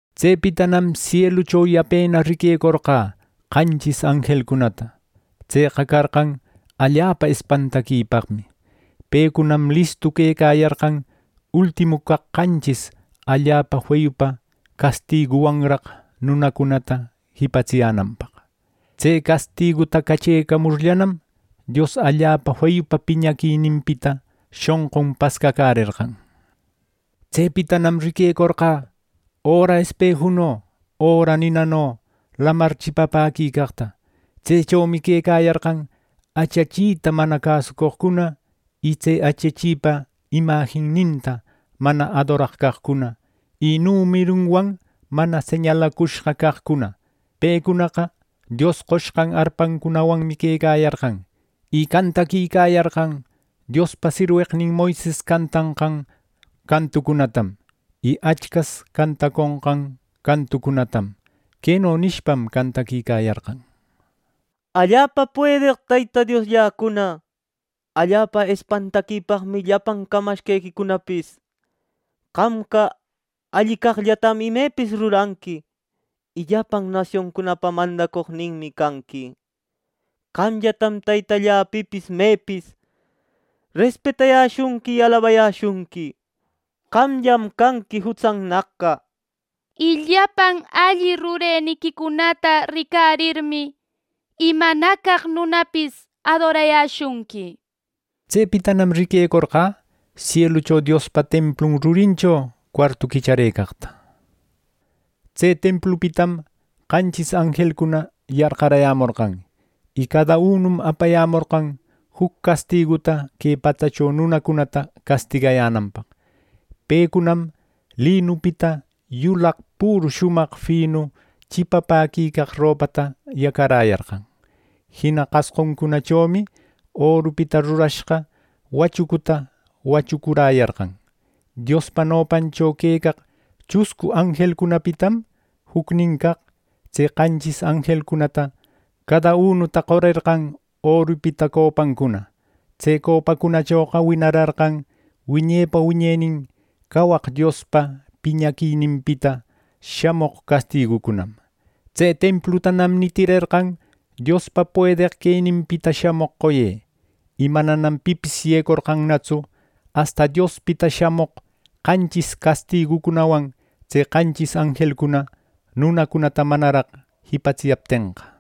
Tsepitanam sielucho yapena riquecorqä qanchis anjelcunata. Tseqa carqan allapa espantaquipaqmi. Pecunam listu quecayarqan ultimu caq qanchis allapa feyupa castiguwanraq nunacunata jipatsiyänanpaq. Tse castiguta cachecamurllanam, Dios allapa feyupa piñaquininpita shonqun pascacärerqan. Tsepitanam riquecorqä, öra espejuno, öra ninano, lamar chipapäquicaqta. Tsechomi quecayarqan achachita mana cäsoqcuna, y tse achachipa imajinninta mana adoraq caqcuna y numerunwan mana señalacushqa caqcuna. Pecunaqa Dios qoshqan arpancunawanmi quecayarqan. Y cantaquicayarqan Diospa sirweqnin Moises cantanqan cantucunatam y Achcas cantaconqan cantucunatam. Queno nishpam cantaquicayarqan: “Allapa puedeq Teyta Dioslläcuna, allapa espantaquipaqmi llapan camashqequicunapis. Qamqa alli caqllatam imepis ruranqui, y llapan nasioncunapa mandacoqninmi canqui. Qamllatam Teytallä pipis mepis respetayäshunqui y alabayäshunqui. Qamllam canqui jutsannaqqa. Y llapan alli rureniquicunata ricarirmi, imanacaq nunapis adorayäshunqui” nir. Tsepitanam riquecorqä sielucho Diospa templun rurincho cuartu quichacäreqta. Tse templupitam qanchis anjelcuna yarqarayämorqan, y cada unum apayämorqan juc castiguta que patsacho nunacunata castigayänanpaq. Pecunam linupita yulaq püru shumaq finu chipapäquicaq ropata yacaräyarqan. Jina qasquncunachomi orupita rurashqa wachucuta wachucuräyarqan. Diospa nopancho queqaq chuscu anjelcunapitanam jucnin caq tse qanchis anjelcunata cada unuta qorerqan orupita copancuna. Tse copacunachoqa winararqan wiñepa wiñenin cawaq Diospa piñaquininpita shamoq castigucunam. Tse templutanam nitirerqan Diospa puedeq queninpita shamoq qoye, y mananam pipis yecorqantsu asta Diospita shamoq qanchis castigucunawan tse qanchis anjelcuna nunacunata manaraq jipatsiyaptenqa.